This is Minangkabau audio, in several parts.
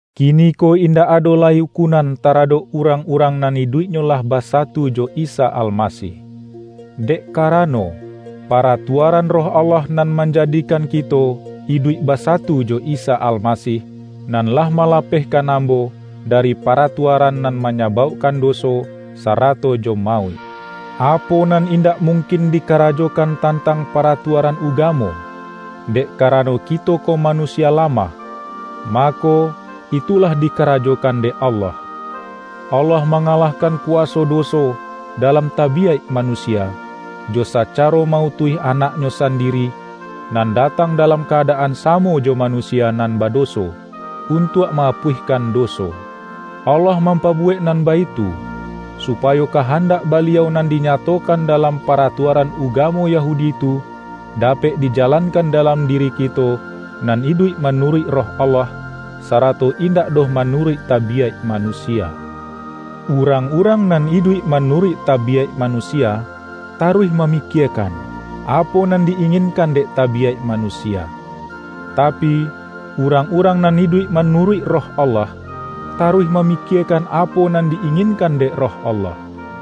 Kiniko indak ado lai ukunan taradok urang-urang nan iduiknyo lah basatu jo Isa Almasih. Dek karano, paratuaran Roh Allah nan manjadikan kito iduik basatu jo Isa Almasih, nan lah malapehkan ambo dari paratuaran nan manyabaukkan doso, sarato jo mauik. Apo nan indak mungkin dikarajokan tantang paratuaran ugamo, dek karano kito ko manusia lamah, mako, itu lah dikarajokan dek Allah. Allah mangalahkan kuwaso doso dalam tabiyaik manusia, jo sacaro ma-utuih Anak-Nyo sandiri, nan datang dalam ka-adaan samo jo manusia nan badoso, untuak ma-apuihkan doso. Allah mampabuwek nan baitu, supayo kahandak Baliau nan dinyatokan dalam paratuaran ugamo Yahudi tu, dapek dijalankan dalam diri kito nan iduik manuruik Roh Allah, sarato indak doh manuruik tabiyaik manusia. Urang-urang nan iduik manuruik tabiyaik manusia, taruih mamikiekan, apo nan di-inginkan dek tabiyaik manusia. Tapi, urang-urang nan iduik manuruik Roh Allah, taruih mamikiekan apo nan di-inginkan dek Roh Allah.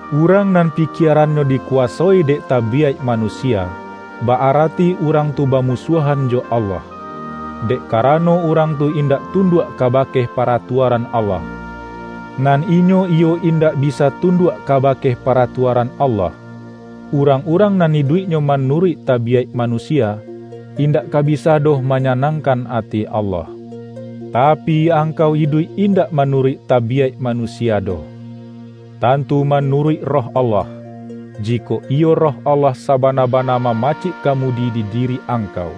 Urang nan pikierannyo dikuwasoi dek tabiyaik manusia, ba-arati urang tu bamusuahan jo Allah; dek karano urang tu indak tunduak kabake paratuaran Allah; nan inyo iyo indak bisa tunduak kabake paratuaran Allah. Urang-urang nan iduiknyo manuruik tabiyaik manusia, indak ka bisa doh manyanangkan ati Allah. Tapi, angkau iduik indak manuruik tabiyaik manusia doh. Tantu manuruik Roh Allah, - jikok iyo Roh Allah sabana-bana mamacik kamudi di diri angkau.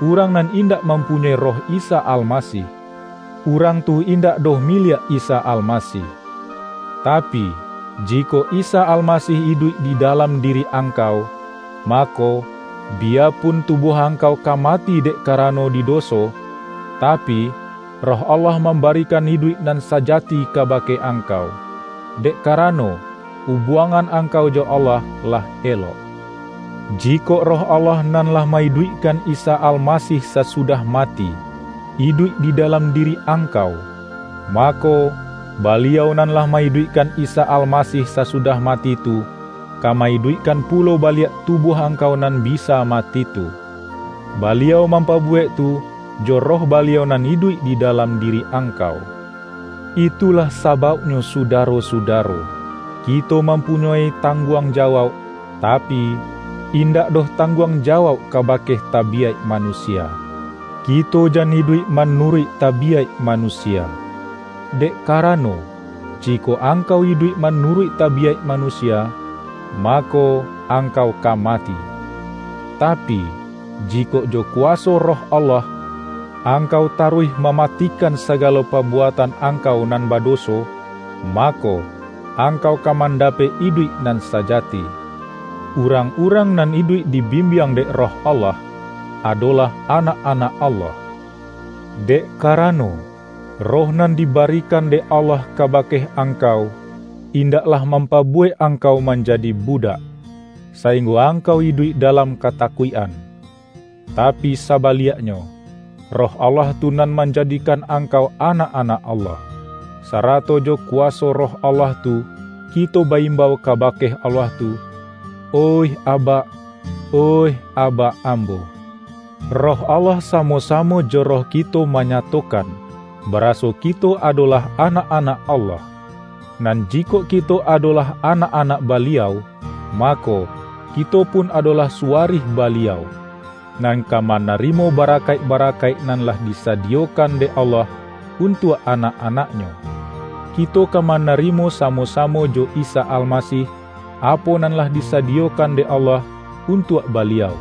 Urang nan indak mampunyoi Roh Isa Almasih, urang tu indak doh miliak Isa Almasih. Tapi, jikok Isa Almasih iduik di dalam diri angkau, mako, biyapun tubuah angkau ka mati dek karano di doso, tapi, Roh Allah mambarikan iduik nan sajati kabake angkau, dek karano, ubuangan angkau jo Allah lah elok. Jikok Roh Allah nan lah ma-iduikkan Isa Almasih sasu-dah mati, iduik di dalam diri angkau, mako, Baliau nan lah ma-iduikkan Isa Almasih sasudah mati tu, ka ma-iduikkan pulo baliak tubuah angkau nan bisa mati tu. Baliau mampabuwek tu jo Roh Baliau nan iduik di dalam diri angkau. Itulah sabauknyo sudaro-sudaro, kito mampunyoi tangguang jawauk; tapi, indak doh tangguang jawauk kabake tabiyaik manusia; kito jan iduik manuruik tabiyaik manusia. Dek karano, jikok angkau iduik manuruik tabiyaik manusia, mako, angkau ka mati; tapi, jikok jo kuwaso Roh Allah, angkau taruih mamatikan sagalo pabuatan angkau nan badoso, mako, angkau ka mandapek iduik nan sajati. Urang-urang nan iduik dibimbiang dek Roh Allah, adolah anak-anak Allah. Dek karano, Roh nan dibarikan dek Allah kabake angkau, indaklah mampabuwek angkau manjadi budak, sainggo angkau iduik dalam katakuik-an. Tapi, sabaliaknyo, Roh Allah tu nan manjadikan angkau anak-anak Allah. Sarato jo kuwaso Roh Allah tu kito ba-imbau kabake Allah tu,”Oih Abak, oih Abak ambo!” Roh Allah samo-samo jo roh kito manyatokan, baraso kito adolah anak-anak Allah. Nan jikok kito adolah anak-anak Baliau, mako, kito pun adolah suwarih Baliau, nan ka manarimo barakaik-barakaik nan lah disadiyokan dek Allah untuak anak-anak-Nyo. Kito ka manarimo samo-samo jo Isa Almasih, apo nan lah disadiyokan dek Allah untuak Baliau;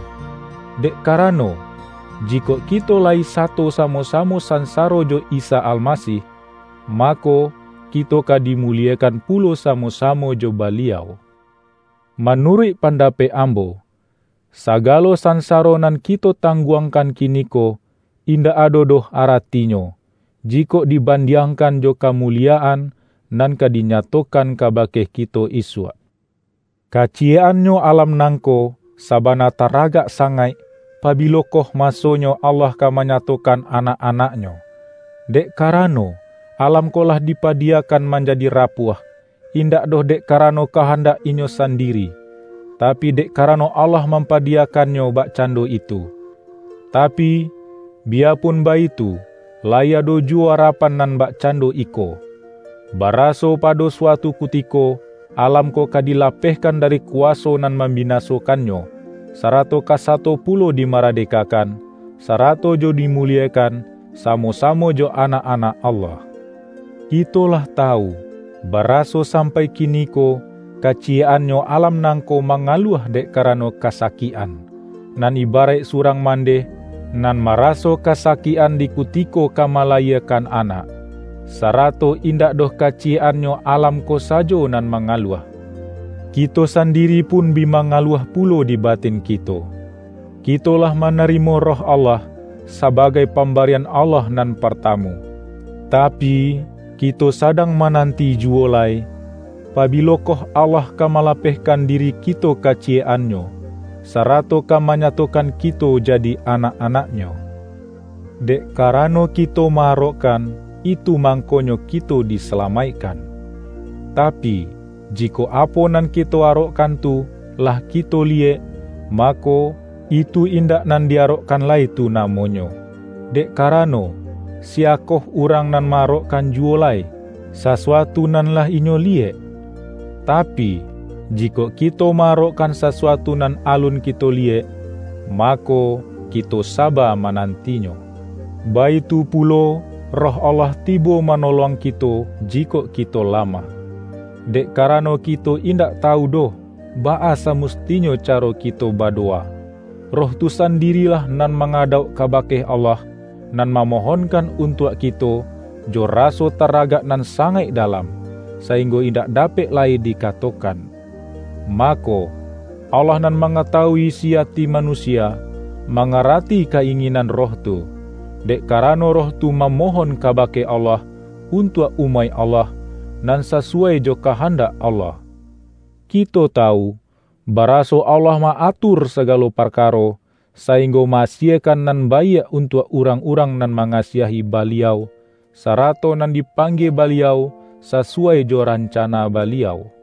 dek karano, jikok kito layi sato samo-samo sansaro jo Isa Almasih, mako, kito ka dimuliekan pulo samo-samo jo Baliau. Manuruik pandapek ambo, sagalo sansaro nan kito tangguangkan kiniko, indak ado doh aratinyo, jikok dibandiangkan jo kamuliyaan, nan ka dinyatokan kabake kito isuak. Kaciyek-annyo alam nangko, sabana taragak sangaik, pabilokoh masonyo Allah ka manyatokan anak-anak-Nyo. Dek karano, alam ko lah dipadiyakan manjadi rapuah, indak doh dek karano kahandak inyo sandiri, tapi, dek karano Allah mampadiyakannyo bakcando itu. Tapi, biyapun baitu, layi ado juwo arapan nan bakcando iko: baraso pado suatu kutiko, alam ko ka dilapehkan dari kuwaso nan mambinasokannyo, sarato ka sato pulo dimardekakan, sarato jo dimuliekan samo-samo jo anak-anak Allah. Kito lah tawu, baraso sampai kiniko, kaciyek-annyo alam nangko mangaluah dek karano kasakik-an, nan ibaraik surang mandeh, nan maraso kasakik-an di kutiko ka malayiekan anak. Sarato indak doh kaciyek-annyo alam ko sajo nan mangaluah; kito sandiri pun bi mangaluah pulo di batin kito. Kito lah manarimo Roh Allah, sabagai pambarian Allah nan partamu, tapi, kito sadang mananti juwo lai, pabilokoh Allah ka malapehkan diri kito kaciyek-annyo, sarato ka manyatokan kito jadi anak-anak-Nyo. Dek karano kito ma-arokkan, itu mangkonyo kito disalamaikkan. Tapi, jikok apo nan kito arokkan tu, lah kito liyek, mako, itu indak nan di-arokkan lai tu namonyo. Dek karano, siyakoh urang nan ma-arokkan juwo lai, sasuatu nan lah inyo liyek? Tapi, jikok kito ma-arokkan sasuatu nan alun kito liyek, mako, kito saba manantinyo. Baitu pulo, Roh Allah tibo manolong kito jikok kito lamah. Dek karano kito indak tawu doh, baa samustinyo caro kito badowa; Roh tu sandirilah nan mangadauk kabake Allah, nan mamohonkan untuak kito, jo raso taragak nan sangaik dalam, sainggo indak dapek lai dikatokan. Mako, Allah nan mangatawui isi ati manusia, mangarati ka-inginan Roh tu; dek karano Roh tu mamohon kabake Allah, untuak umaik Allah, nan sasuwai jo kahandak Allah. Kito tawu, baraso Allah ma-atur sagalo parkaro, sainggo ma-asiekan nan baiak untuak urang-urang nan mangasiahi Baliau, sarato nan dipanggie Baliau sasuwai jo rancana Baliau.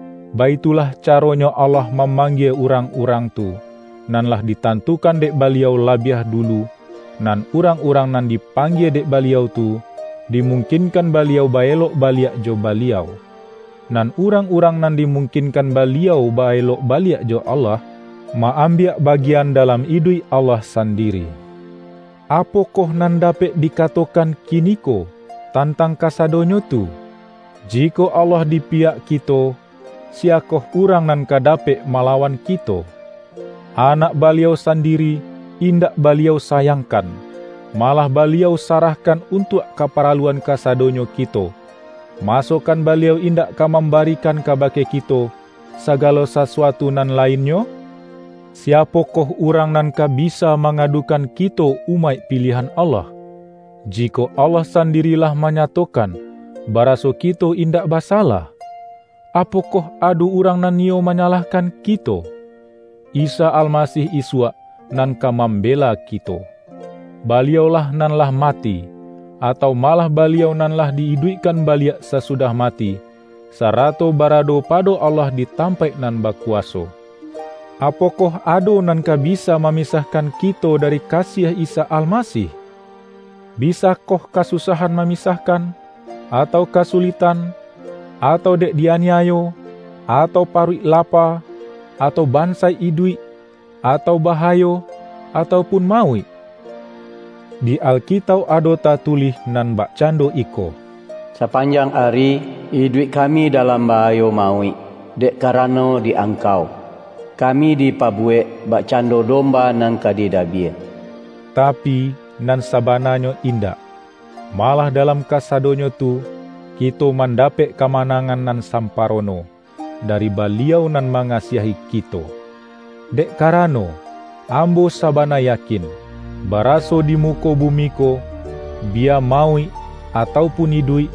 Baitulah caronyo Allah mamanggie urang-urang tu, nan lah ditantukan dek Baliau labiah dulu; nan urang-urang nan dipanggie dek Baliau tu, dimungkinkan Baliau ba-elok baliak jo Baliau. Nan urang-urang nan dimungkinkan Baliau ba-elok baliak jo Allah, ma-ambiak bagian dalam iduik Allah sandiri. Apokoh nan dapek dikatokan kiniko, tantang kasadonyo tu? Jikok Allah dipiyak kito, siyakoh urang nan ka dapek malawan kito? Anak Baliau sandiri, indak Baliau sayangkan, malah Baliau sarahkan untuak kaparaluan kasadonyo kito; masokan Baliau indak ka mambarikan kabake kito, sagalo sasuatu nan lainnyo? Siapokoh urang nan ka bisa mangadukan kito umaik piliahan Allah, jikok Allah sandiri lah manyatokan, baraso kito indak basalah? Apokoh ado urang nan niyo manyalahkan kito? Isa Almasih isuak, nan ka mambela kito! Baliau-lah nan lah mati, atau malah Baliau nan lah di-iduikkan baliak sasudah mati, sarato barado pado Allah di tampaik nan bakuwaso. Apokoh ado nan ka bisa mamisahkan kito dari kasiah Isa Almasih? Bisakoh kasusahan mamisahkan, atau kasuliktan, atau dek di-aniayo, atau paruik lapa, atau bansaik iduik, atau bahayo, atau pun mauik? Di Alkitauk ado tatulih nan bakcando iko,”Sapanjang ari, iduik kami dalam bahayo mauik dek karano di Angkau. Kami dipabuwek bakcando domba nan ka didabiah.” Tapi, nan sabananyo indak! Malah dalam kasadonyo tu, kito mandapek kamanangan nan samparono, dari Baliau nan mangasiahi kito! Dek karano, ambo sabana yakin, baraso di muko bumi ko, biya mauik atau pun iduik,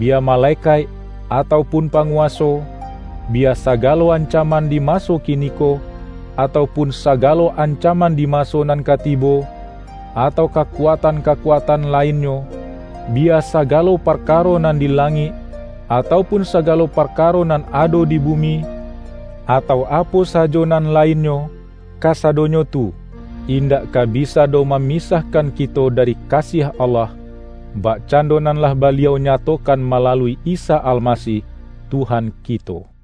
biya malekaik atau pun panguwaso, biya sagalo ancaman di maso kiniko, atau pun sagalo ancaman di maso nan ka tibo, atau kakuatan-kakuatan lainnyo; biya sagalo parkaro nan di langik, atau pun sagalo parkaro nan ado di bumi, atau apo sajo nan lainnyo, kasadonyo tu, indak ka bisa doh mamisahkan kito dari kasiah Allah, bakcando nan lah Baliau nyatokan malalui Isa Almasih, Tuhan kito. ROMA